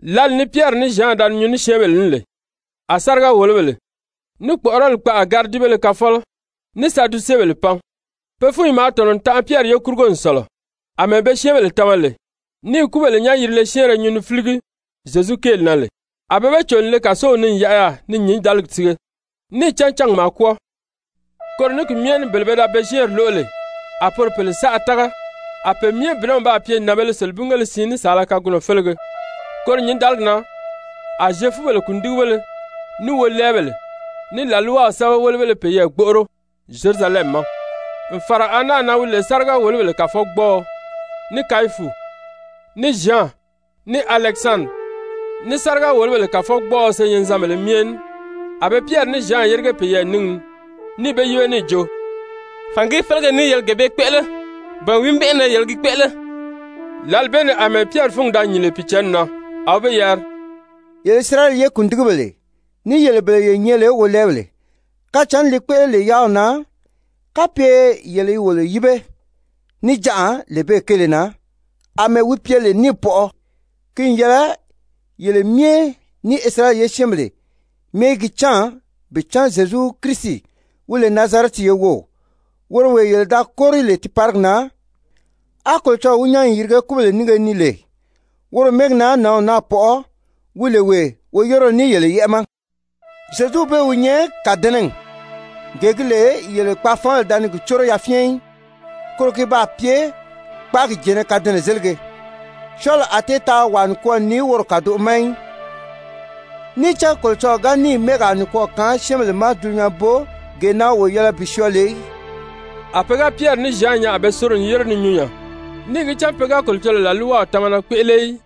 Lǎli ni Pyɛri ní Zyan da ni nyuu ní syɛ́ɛnbèle ní lè, a sáriga-wòlobèle, ní kpɔ̀ʔɔrɔli kpaʔa gáridibéle kafɔlɔ, ní Sadusebèle pan. Pe fúnyi maa tɔ̀nɔ n tanʔa Pyɛri ye kurugo n sɔ̀lɔ, àmɛɛ be syɛ́ɛnbèle tama lè, ní i kúbèle nyán-yirile syɛ́ɛnrɛ nyuu ni fíligi Zyezu kéeli na lè. A be be cò n le kàsow ni n yaʔa yaà ni nyǐndaligi sige, níì cán cángi maa kwɔ́ɔ. Koro ní ki myɛ ní bele pe da be syɛ́ɛnri lóʔo lè, a poro pèle saʔa tága, a pe myɛ bìnɛw baa pye nànbēle selebingéle siin ní saala kagunɔ félege. Koro nyǐndaligi na a Zyefubèle kùndigibéle ní wolɛɛbèle, ní làlwaw sɛ́bɛwelebéle peyɛɛ gbóʔoro Zyerusalɛmi ma, n fàra Ana na wi lè sáriga-wòlobèle kàfɔgbɔɔɔ, ní Kayifu, ní Zyan, ní Alɛkisandiri, ní sáriga-wòlobèle kàfɔgbɔɔɔ senyɛnzanbèlē myɛ ní. A be Pyɛri ní Zyan yérige peyɛɛ níngi ni, níì be yíbe níì jo: «Fàngìí félege ní yele gee bee kpéʔele, ba wìí mɛ́ʔɛ na yele gi kpéʔele?» Lǎli bee ni àmɛɛ Pyɛri fúngi da nyìn lè Pìicǎnni na, a wi be yari: «Yele Isirayɛli ye kùndigibèle ní yele bele ye nyɛ lè wolɛɛbèle, kacǎnni li kpéʔele lè yáaw na, kapye yele i wolo yíbe níjanʔa lee bee kéele na àmɛɛ wi pye lè níì pɔʔɔ, ki n yɛlɛ yele myɛ, ní Isirayɛli ye syɛ́ɛnbèle myɛ í gi cán bi cán Zyezu Kirisi wi lè Nazarɛti ye wów, woro wee yele da kóri lè tiiparigi na, á Kolocɔlɔɔ wi nyán n yirige kúbèle nínge ni lè, woro mɛ́ɛgi na nǎnw naa pɔʔɔ, wi lè wee woyéreo ní yele yɛ́ʔɛ ma. Zyezuw bee wi nyɛ ‹Kàdɛnɛgi, gee gi lè yele kpaafaanbèle da ni gi córo yafyɛn í, koro ki baa pye kpáagi jɛ̀ɛ́nnɛ kadɛnɛzelige.› Syɔɔli a tée taa wàa nikwɔɔ ni woro kàdoʔo ma í. Níì cán Kolocɔlɔɔ ga níì mɛ́ɛgaa nikwɔɔ kaan syɛ́ɛnbèle ma dulunyanbo gee na wo yɛlɛ bi syɔɔ lè í.» A pe ga Pyɛri ní Zyan nyaa a be soro n yére ni nyuu nya, níì gi cán pe ga Kolocɔlɔɔ làlwaw tamana kpéʔele í,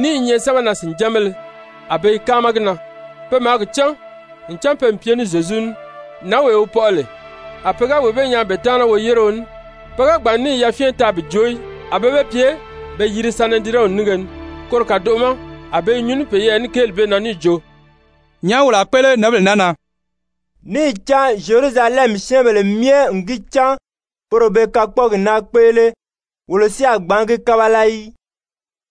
ní i nyɛ sɛ́bɛnaa-sìnjanbéle, a be i káama gi na. Pe maa gi cán, ncan pe n pye ní Zyezu ní. Nǎnwee wi pɔʔɔ lè, a pe ga wee bee nyaa be taana woyéreo ní, pe ga gbàn n níì yafyɛn taa bi joo í. A be be pye be yiri Sanedirɛnw nínge ni, koro kàdoʔo ma a be i nyuu ní peyɛɛ ní kéeli bee na níì jo: «Nyàʔá wolo a kpéʔele nǎnbèle naa na? Níì cán Zyerusalɛmi syɛ́ɛnbèle myɛ n gi cán poro be kakpɔɔgi naa kpéʔele, wolo si a gbǎn gi kábala í.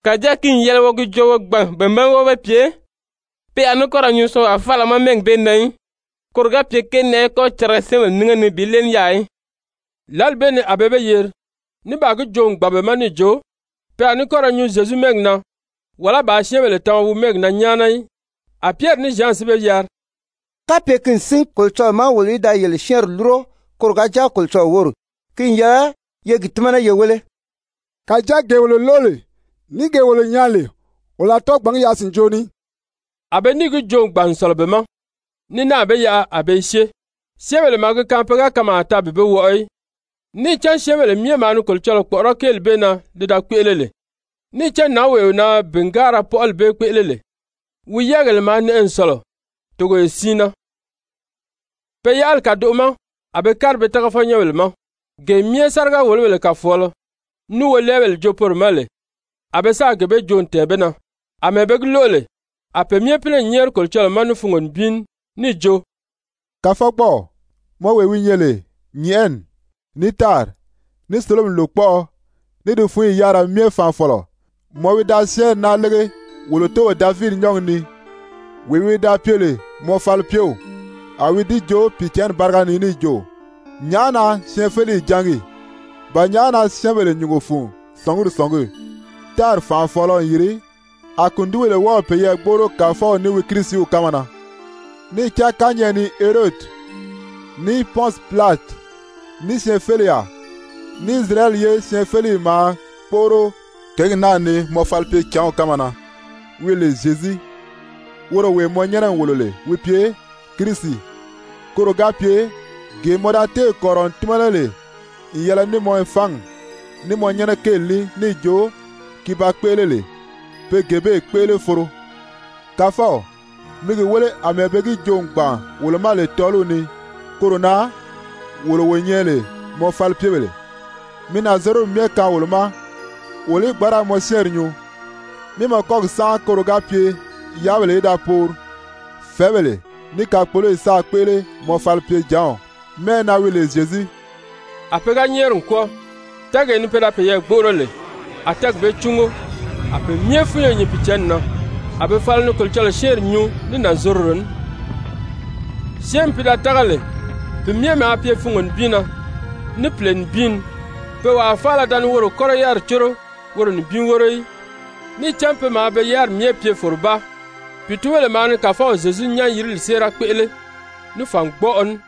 Kàjáa ki n yɛlɛ wo gi joo wo gbàn be ma wó be pye pe a ní kɔ́ ra nyuu syɔɔnwaa faala ma mɛ́ɛgi bee na í, koro ga pye kéeli naa í kɔ́ cariga syɛ́ɛnbèle nínge ni bi léeli yaà í.» Lǎli bee ni a be be yeri, ní baa gi joo n gbàn be ma níì jo, pe a ní kɔ́ ra nyuu Zyezu mɛ́ɛgi na wàlá bàā syɛ́ɛnbèle tama wi mɛ́ɛgi na nyáana í. A Pyɛri ní Zyan si be yari: «Kapye ki n sín Kolocɔlɔɔ ma wolo í da yele syɛ́ɛnri lúro koro ga jáa Kolocɔlɔɔ wóri, ki n yɛlɛ ye gi tímana ye wéle. Kàjáa gee wolo lóʔo lè ní gee wolo nyaa lè, wolo a tɔ́ɔ gbǎn gi yaʔa sìnjoo ni í.» A be níì gi joo n gbàn n sɔ̀lɔ be ma, ní náà be yaʔa a be i syée, syɛ́ɛnbèle maa gi kaan pe ga kanmaa taa bi be wɔʔɔ í. Níì cán syɛ́ɛnbèle myɛ maa ni Kolocɔlɔɔ kpɔ̀ʔɔrɔ́ kéeli bee na li da kpéʔele lè. Níì cán nǎnwee na bìngaara pɔʔɔli bee da kpéʔele lè, wi yɛ́ɛgèle maa nɛʔɛ n sɔ̀lɔ togoye siin na. Pe yaʔali kàdoʔo ma a be kári be tágafɔnyɛnbèle ma, gee myɛ sáriga-wòlobèle kàfɔɔlɔ ní wolɛɛbèle joo poro ma lè, a be sáà gee bee joo n tɛ̀ɛn be na. Amɛɛ be gi lóʔo lè, a pe myɛ pínɛ n nyɛ́ɛri Kolocɔlɔɔ ma ní fungo nibin ní níì jo: «Kàfɔgbɔɔw, mɔ wee wi nyɛ lè nyɛ̀ʔɛni, ní tári, ní sólomi lòkpɔʔɔ, ní di fúnyi yárira myɛ faanfɔlɔ, mɔ wi da syɛ́ɛnri naa lége wolo tóow Davidi nyɔ́ɔgi ni, wee wi da pye lè mɔ falipyew, a wi di joo Pìicǎnni báriga ni níì jo: ‹Nyàʔá na syɛɛnfeleyi jángi? Ba nyàʔá na syɛ́ɛnbèle nyùngo fun sɔ̀nguri sɔ̀ngí? Tári fànʔafɔɔlɔ n yìri, A kùndigibèle wɔ́ɔ̀ peyɛɛ gbóʔoro Kàfɔw ní wi Kirisiw kánma na.› Níì cán kányɛʔɛ ni Herodi, ní Pɔnsi Pilati, ní syɛɛnfeleyaa, ní Isirayɛli ye syɛɛnfeleyi maa kpóʔoro kěgi naa ni mɔ falipyecǎnw kánma na wi lè Zyezu, woro wee mɔ nyɛ́nɛ n wòlo lè wi pye Kirisi, koro ga pye, gee mɔ da téè kɔ̀rirɔ n tímana lè n yɛlɛ ní mɔ fangi, ní mɔ nyɛ́nɛ kéeli ní níì jo ki ba kpéʔele lè, pe gee bee kpéʔele foro. Kàfɔw, mi gi wéle àmɛɛ be gi joo n gbàn wolo ma lè tɔ́ɔliw ni, koro na wolo wo nyɛ lè mɔ falipyebèle, mi nànzorodi myɛ kaan wolo ma wolo í gbǎn ra mɔ syɛ́ɛnri nyuu, mí mɔ kɔ́gi sánʔa koro ga pye yáabèle í da poori, fɛ̀ɛ́bèle, ní kakpoloyi sáā kpéʔele mɔ falipyecǎnw mɛ́ʔɛ na wi lè Zyezu.» A pe ga nyɛ́ɛri n kwɔ́ɔ, tɛ́ɛgee ni pe da peyɛɛ gbóʔoro lè, a tɛ́ɛgi bee cúngo. A pe myɛ fúnyo nyìn Pìicǎnni na, a be fala ni Kolocɔlɔɔ syɛ́ɛnri nyuu ní nànzorodo ní. Syɛ́ɛnmi pi da tága lè, pi myɛ maa pye fungo nibin na, ní pìle nibin ni. Pe wàa faala da ni woro kɔ́lɔ yáriri córo woro nibin wóro í, níì cán pe maa be yáriri myɛ pye fòrobáa. Pìitunbèle maa ni Kàfɔw Zyezu nyán-yirili séera kpéʔele ní fàngbɔʔɔ ní.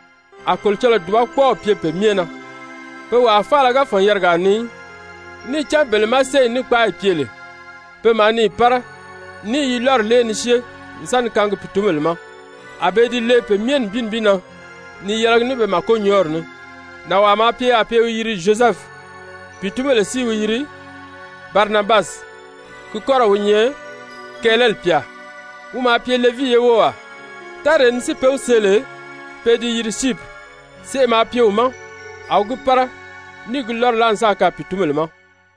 A Kolocɔlɔɔ dùbakpɔɔw pye pe myɛ na. Pe wàa faala ga fɔ̀n yarigaa ni í. Níì cán bele má séyi ní kpáayi pye lè, pe maa ni yi pára ní i yi lɔ́ri lée ni syée n sa ni kaangi pìitunbèle ma, a be i di lee pe myɛ nibin nibin na ni yɛlɛgi ní be màkonyɔɔri ní. Nànwaa maa pye yaà pe i wi yiri Zyozɛfu, pìitunbèle si i wi yiri Barinabasi, ki kɔ́rɔw wi nyɛ kɛɛlɛli pyà, wi maa pye Levii ye wówaa, táree ni si be wi see lè pe i di yiri Syipiri. Seʔe maa pye wi ma, a wi gi pára níì gi lɔ́ri láa n sáà kaan pìitunbèle ma.